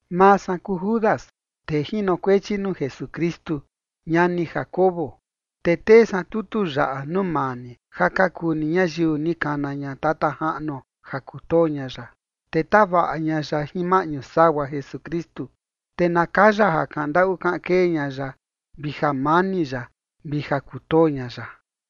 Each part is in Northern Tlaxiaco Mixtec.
Maa san kuu Judas tee jinokuechi nuu Jesukristu, ñani Jacobo. Te tee san tutu yaꞌa nuu maa ni ja ka kuu ni ñayiu ni kana ña Tata Jaꞌnuo ja kutoo ña ya, te tavaꞌa ña ya jin maꞌñu sagua Jesukristu. Te na kaya ja kaꞌan ndaꞌu kaꞌan kee ña ya, vi jamani ya vi ja kutoo ña ya.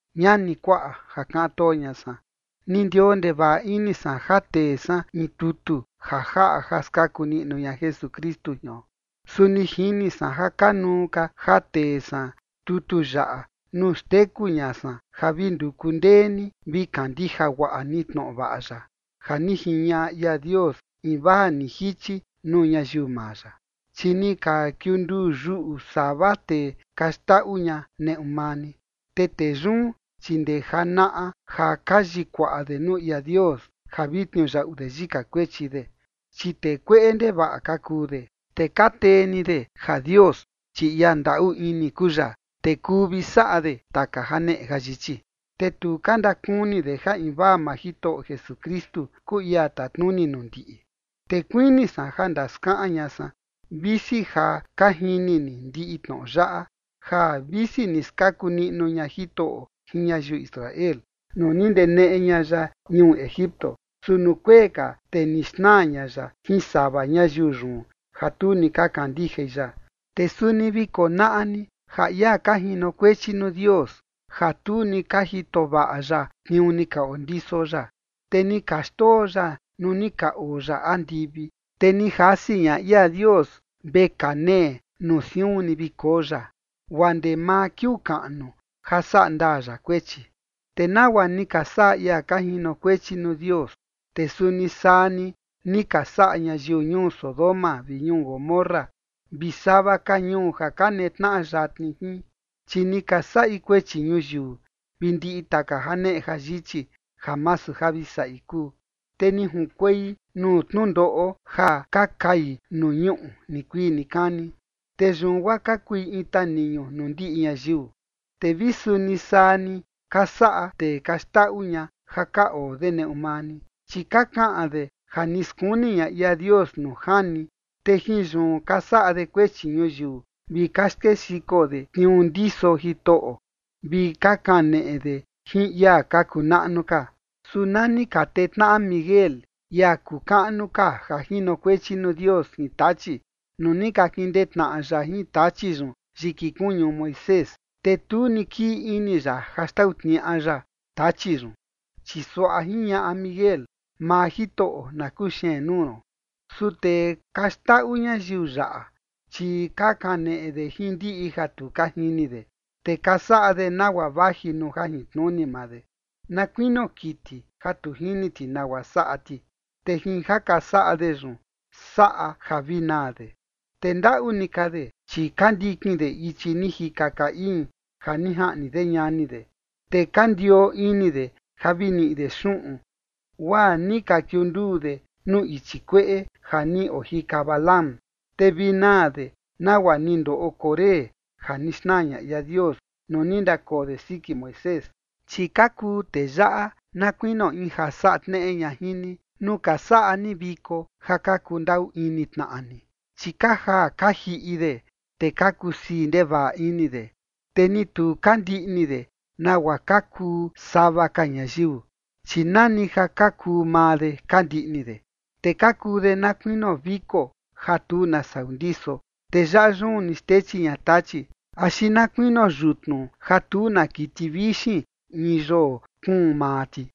Ñani, kuaꞌa, ja kaꞌan too ña san, ni ndioo ndevaꞌa ini san ja tee san in tutu ja jaꞌa ja skaku niꞌnu ña Jesukristu jion. Su ni jini san ja kanuu ka ja tee san tutu yaꞌa nuu xteku ña san ja vi nduku ndee ni vi kandija guaꞌa ni tnoꞌo vaꞌa ya ja ni jiñaꞌa ia Dios invaa ni jichi nuu ñayiu maa ya. Chi ni ka kiunduu yuꞌu sava tee ka xndaꞌu ña neꞌu maa ni. Te tee yun, chi ndee janaꞌa ja ka yikuaꞌa de nuu ia Dios ja vi tniuyaꞌu de yika kuechi de, chi tee kueꞌe ndevaꞌa ka kuu de, te ka tee ni de ja Dios, chi ia ndaꞌu ini kuu ya, te kuu vi saꞌa de taka janeꞌe jayichi, te tu ka ndakuni de ja invaa maa Jitoꞌo Jesukristu kuu ia tatnuni nuu ndiꞌi. Te kuini san ja ndaskaꞌan ña san, visi ja ka jini ni ndiꞌi tnoꞌo yaꞌa, ja visi ni skaku niꞌnu ña Jitoꞌo jin ñayiu Israel nuu ni ndeneꞌe ña ya ñuu Egipto, su nuu kuee ka, te ni xnaa ña ya jin sava ñayiu yun ja tu ni ka kandijai ya. Te suni vi konaꞌa ni ja ia ka jinokuechi nuu Dios ja tu ni ka jito vaꞌa ya tniuu ni ka ondiso ya, te ni ka xndoo ya nuu ni ka oo ya andivi. Te ni jasi ña ia Dios vekaa nee nuu siun ni vi koo ya, guaa ndee maa kiuu kaꞌnu ja saꞌa ndaa ya kuechi. Te nagua ni ka saꞌa ia ka jinokuechi nuu Dios, te suni saa ni, ni ka saꞌa ñayiu ñuu Sodoma vi ñuu Gomorra vi sava ka ñuu ja ka netnaꞌa yatni jin. Chi ni ka saꞌi kuechi ñuyiu vi ndiꞌi taka janeꞌe jayichi ja masu ja vi saꞌi kuu, te ni junkuei nuu tnundoꞌo ja ka kai nuu ñuꞌu nikuii nikani, te yun guaa ka kui in taniñu nuu ndiꞌi ñayiu. Te vi suni saa ni ka saꞌa tee ka xndaꞌu ña ja ka oo de neꞌu maa ni, chi ka kaꞌan de ja ni skuni ña ia Dios nuu jani, te jin yun ka saꞌa de kuechi ñuyiu vi ka skexiko de tniuu ndiso Jitoꞌo vi ka kaneꞌe de jin ia ka kuu naꞌnu ka. Su na ni ka tee tnaꞌa Miguel, ia kuu kaꞌnu ka ja jinokuechi nuu Dios jin Tachi, nuu ni ka kindee tnaꞌa ya jin Tachi yun yiki kuñu Moisés, te tu ni kii ini ya ja xtau tniaꞌa ya Tachi yun, chi suaꞌa jiñaꞌa Miguel: “Maa Jitoꞌo na kuxeen nuu ron”. Su tee ka xndaꞌu ñayiu yaꞌa, chi ka kaneꞌe de jin ndiꞌi ja tu ka jini de. Te ka saꞌa de nagua vaji nuu jajintnuni maa de, na kuinio kiti, ja tu jini ti nagua saꞌa ti, te jin ja ka saꞌa de yun saꞌa ja vi naa de. Te ndaꞌu ni ka de, chi ka ndikin de ichi ni jika Caín ja ni jaꞌni de ñani de, te ka ndioo ini de ja vi niꞌi de xuꞌun, guaa ni ka kiunduu de nuu ichi kueꞌe ja ni ojika Balaam, te vi naa de nagua ni ndoꞌo Coré ja ni xnaa ña ia Dios nuu ni ndakoo de siki Moisés. Chi ka kuu tee yaꞌa na kuinio in ja saꞌa tneꞌe ña jin ni nuu ka saꞌa ni viko ja ka kundaꞌu ini tnaꞌa ni, chi ka jaa ka jiꞌi de, te ka kusii ndevaꞌa ini de, te ni tu ka ndiꞌni de nagua ka kuu sava ka ñayiu, chi nani ja ka kuu maa de ka ndiꞌni de. Te ka kuu de na kuinio viko ja tu na sau ndiso, te yaꞌa yun ni xtechi ña tachi, axi na kuinio yutnu, ja tu na kiti vixin in yoo kuun maa ti.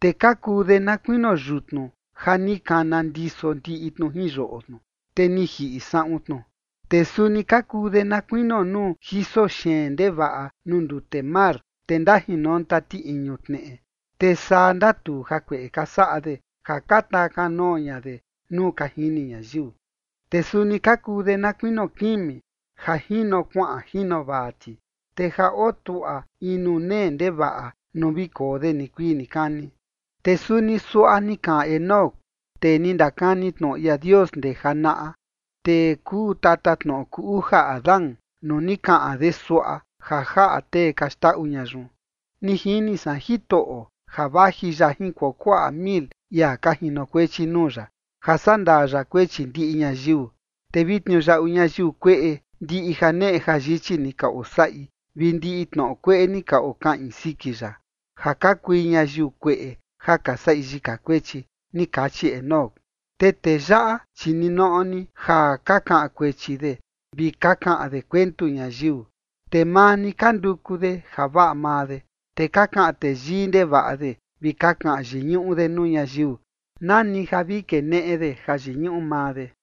Te ka kuu de na kuinio yutnu ja ni kana ndiso ndiꞌi tnu jin yoꞌo tnu, te ni jiꞌi saꞌun tnu. Te suni ka kuu de na kuinio nuu jiso xeen ndevaꞌa nuu ndute mar, te ndajinonta tiꞌiñu tneꞌe, te saa ndatuu jakueꞌe ka saꞌa de ja taa kanoo ña nuu ka jini ñayiu. Te suni ka kuu de na kuinio kimi ja jino kuaꞌan jino vaa ti, te ja otuaꞌa in nuu nee ndevaꞌa nuu vi koo de nikuii nikani. Te suni suaꞌa ni kaꞌan Enoc, tee ni ndakani tnoꞌo ia Dios ndee janaꞌa, tee kuu tatatnoꞌo kuu uja Adán nuu ni kaꞌan de suaꞌa ja jaꞌa tee ka xndaꞌu ña yun: “Ni jini san Jitoꞌo ja vaji ya jin kuakuaꞌa mil ia ka jinokuechi nuu ya, ja saꞌa ndaa ya kuechi ndiꞌi ñayiu, te vi tniuyaꞌu ñayiu kueꞌe ndiꞌi janeꞌe jayichi ni ka osaꞌi vi ndiꞌi tnoꞌo kueꞌe ni ka okaꞌin siki ya, ja ka kui ñayiu kueꞌe ja ka saꞌi yika kuechi”. Ni kachi Enoc. Te tee yaꞌa, chi ninoꞌo ni ja ka kaꞌan kuechi de vi ka kaꞌan de kuentu ñayiu, te maa ni ka nduku de javaꞌa maa de, te ka kaꞌan teyii ndevaꞌa de vi ka kaꞌan yiñuꞌu de nuu ñayiu nani ja vi keneꞌe de jayiñuꞌu maa de.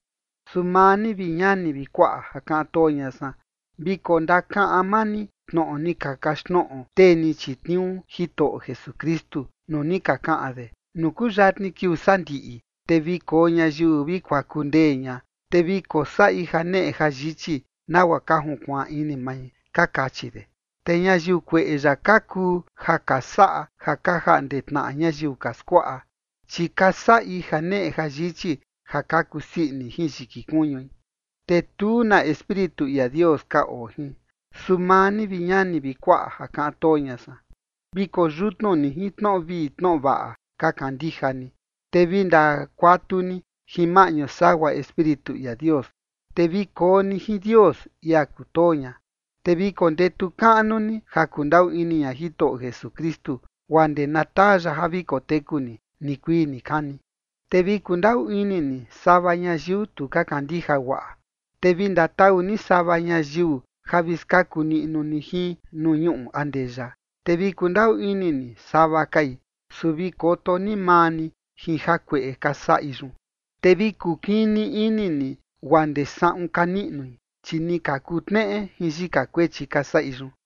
Su maa ni, vi ñani vi kuaꞌa ja kaꞌan too ña san, vi kondakaꞌan maa ni tnoꞌo ni ka kaxtnoꞌo tee ni chitniuu Jitoꞌo Jesukristu, nuu ni ka kaꞌan de: “Nuu kuyatni kiuu sandiꞌi, te vi koo ñayiu vi kuaku ndee ña, te vi kosaꞌi janeꞌe jayichi nagua ka junkuaan ini mai”, ka kachi de. Te ñayiu kueꞌe yaꞌa ka kuu ja ka saꞌa ja ka jaꞌnde tnaꞌa ñayiu ka skuaꞌa, chi ka saꞌi janeꞌe jayichi ja ka kusii ini jin yiki kuñui, te tu na Espíritu ia Dios ka oo jin. Su maa ni, vi ñani vi kuaꞌa ja kaꞌan too ña san, vi koyutnu ni jin tnoꞌo vii tnoꞌo vaꞌa ka kandija ni, te vi ndakuatu ni jin maꞌñu sagua Espíritu ia Dios. Te vi koo ni jin Dios, ia kutoo ña. Te vi kondetu kaꞌnu ni ja kundaꞌu ini ña Jitoꞌo Jesukristu guaa ndee na taa ya ja vi koteku ni nikuii nikani. Te vi kundaꞌu ini ni sava ñayiu tu ka kandija guaꞌa. Te vi ndatau ni sava ñayiu ja vi skaku niꞌnu ni jin nuu ñuꞌu andeya, te vi kundaꞌu ini ni sava kai, su vi koto ni maa ni jin jakueꞌe ka saꞌi yun, te vi kukini ini ni guaa ndee saꞌun ka niꞌnui, chi ni ka kuu tneꞌe jin yika kuechi ka saꞌi yun.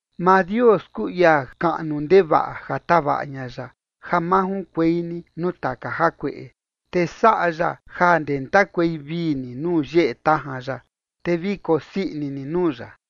Maa Dios kuu ia kaꞌnu ndevaꞌa ja tavaꞌa ña ya ja ma junkuei ni nuu taka jakueꞌe, te saꞌa ya ja ndentakuei vii ni nuu yeꞌe tajan ya, te vi kosii ini ni nuu ya.